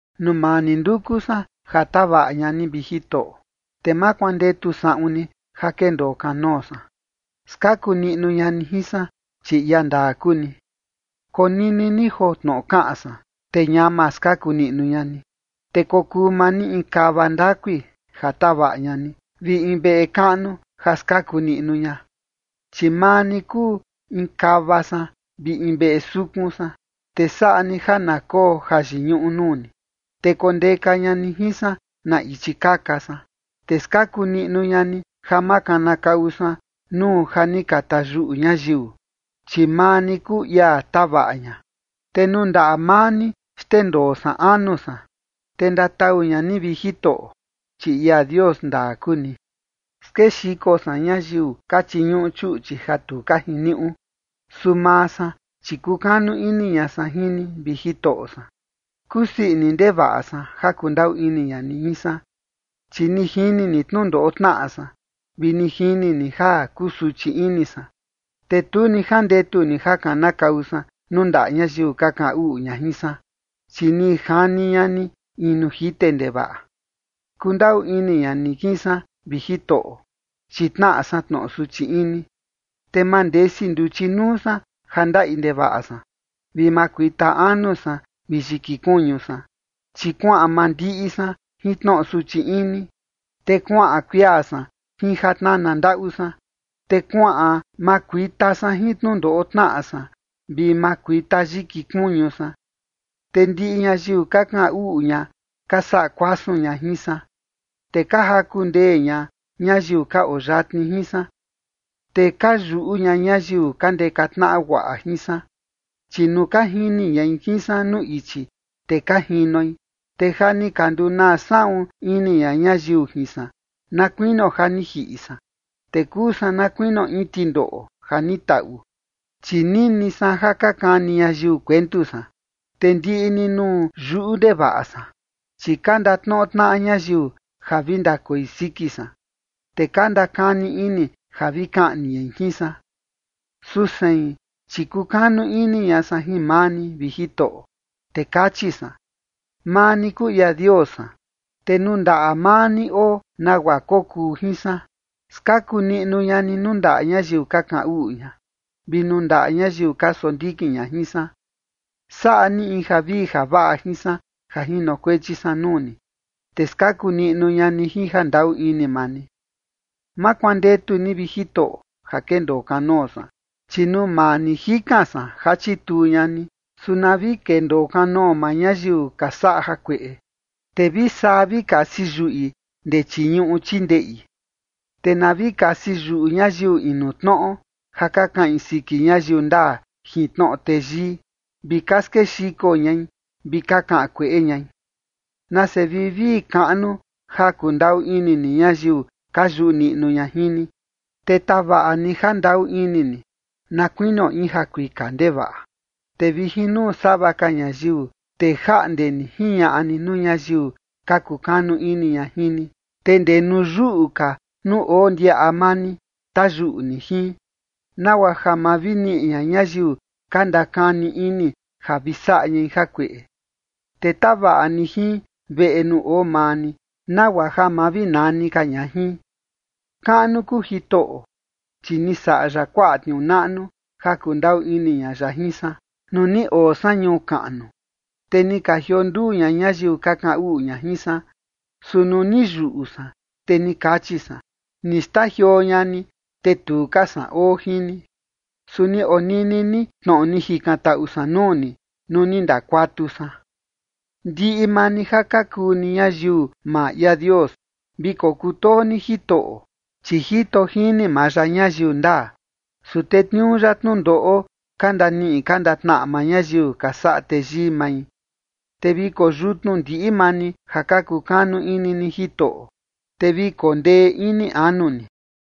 Nuu maa ni nduku san ja tavaꞌa ña ni, vi Jitoꞌo, te ma kuandetu saꞌun ni ja kendoo kanoo san. Skaku niꞌnu ña ni jin san, chi ia ndaa kuu ni. Konini ni joo tnoꞌo kaꞌan san, te ñama skaku niꞌnu ña ni, te kokuu maa ni in kava ndakui ja tavaꞌa ña ni, vi in veꞌe kaꞌnu ja skaku niꞌnu ña. Chi maa ni kuu in kava san vi in veꞌe sukun san, te saꞌa ni ja na koo jayiñuꞌu nuu ni, te kondeka ña ni jin san na ichi kaka san. Te skaku niꞌnu ña ni ja ma kanakau san nuu ja ni ka tayuꞌu ñayiu, chi maa ni kuu ia tavaꞌa ña. Te nuu ndaꞌa maa ni xndendoo san anu san, te ndatau ña ni, vi Jitoꞌo, chi ia Dios ndaa kuu ni. Skexiko san ñayiu ka chiñuꞌu chuꞌchi ja tu ka jiniuꞌu, su maa san, chi kukanu ini ña san jin ni, vi Jitoꞌo san. Kusii ini ndevaꞌa san ja kundaꞌu ini ña ni jin san, chi ni jini ni tnundoꞌo tnaꞌa san, vi ni jini ni ja kusuchi ini san. Te tu ni jandetu ni ja kanakau san nuu ndaꞌa ñayiu ka kaꞌan uꞌu ña jin san, chi ni jani ña ni in nuu jite ndevaꞌa. Kundaꞌu ini ña ni jin san, vi Jitoꞌo, chi tnaꞌa san tnoꞌo suchi ini, te mandesi nduchi nuu san ja ndaꞌi ndevaꞌa san, vi makuita anu san vi yiki kuñu san. Chi kuaꞌan mandiꞌi san jin tnoꞌo suchi ini, te kuaꞌan kuia san jin ja tnana ndaꞌu san, te kuaꞌan makuita san jin tnundoꞌo tnaꞌa san vi makuita yiki kuñu san. Te ndiꞌi ñayiu ka kaꞌan uꞌu ña ka saꞌa kuasun ña jin san, te ka jaku ndee ña ñayiu ka oo yatni jin san, te ka yuꞌu ña ñayiu ka ndeka tnaꞌa guaꞌa jin san, chi nuu ka jini ñai jin san nuu ichi, te ka jinoi. Te ja ni ka ndunaa saꞌun ini ña ñayiu jin san, na kuinio ja ni jiꞌi san, te kuu san na kuinio in tindoꞌo ja ni taꞌu. Chi nini san ja ka kani ñayiu kuentu san, te ndiꞌi ni nuu yuꞌu ndevaꞌa san, chi ka ndatnoꞌo tnaꞌa ñayiu ja vi ndakoi siki san, te ka ndakani ini ja vi kaꞌni ñai jin san. Su sein, chi kukanu ini ña san jin maa ni, vi Jitoꞌo, te kachi san: “Maa ni kuu ia Dios san”. Te nuu ndaꞌa maa ni oo nagua kokuu jin san. Skaku niꞌnu ña ni nuu ndaꞌa ñayiu ka kaꞌan uꞌu ña, vi nuu ndaꞌa ñayiu ka sondikin ña jin san. Saꞌa ni in javii javaꞌa jin san ja jinokuechi san nuu ni, te skaku niꞌnu ña ni jin jandaꞌu ini maa ni. Ma kuandetu ni, vi Jitoꞌo, ja kendoo kanoo san, chi nuu maa ni jikan san ja chituu ña ni. Su na vi kendoo kanoo maa ñayiu ka saꞌa jakueꞌe, te vi saa vi kasi yuꞌi ndee chii ñuꞌu chii ndeꞌi. Te na vi kasi yuꞌu ñayiu inu tnoꞌo ja ka kaꞌin siki ñayiu ndaa jin tnoꞌo teyii, vi ka skexiko ñai vi ka kaꞌan kueꞌe ñai. Nase vivii kaꞌnu ja kundaꞌu ini ni ñayiu ka yuꞌu niꞌnu ña jin ni, te tavaꞌa ni jandaꞌu ini ni na kuinio in jakuika ndevaꞌa, te vi jin nuu sava ka ñayiu, te jaꞌnde ni jiñaꞌa ni nuu ñayiu ka kukanu ini ña jin ni. Te ndee nuu yuꞌu ka nuu oo ndiaꞌa maa ni, tayuꞌu ni jin, nagua ja ma vi niꞌi ña ñayiu ka ndakani ini ja vi saꞌa ñai jakueꞌe, te tavaꞌa ni jin veꞌe nuu oo maa ni, nagua ja ma vi nani ka ña jin. Kaꞌnu kuu Jitoꞌo, chi ni saꞌa ya kuaꞌa tniuu naꞌnu ja kundaꞌu ini ña ya jin san, nuu ni oo san ñuu kaꞌnu, te ni ka jionduu ña ñayiu ka kaꞌan uꞌu ña jin san. Su nuu ni yuꞌu san, te ni kachi san: “Ni xtajioo ña ni, te tu ka san oo jin ni”. Su ni onini ni tnoꞌo ni jikantaꞌu san nuu ni, nuu ni ndakuatu san. Ndiꞌi maa ni ja ka kuu ni ñayiu maa ia Dios, vi kokutoo ni Jitoꞌo, chi jito jini maa ya ñayiu ndaa, su tetniuu ya tnundoꞌo ka ndaniꞌi ka ndatnaꞌa maa ñayiu ka saꞌa teyii mai. Te vi koyutnu ndiꞌi maa ni ja ka kukanu ini ni Jitoꞌo, te vi kondee ini anu ni.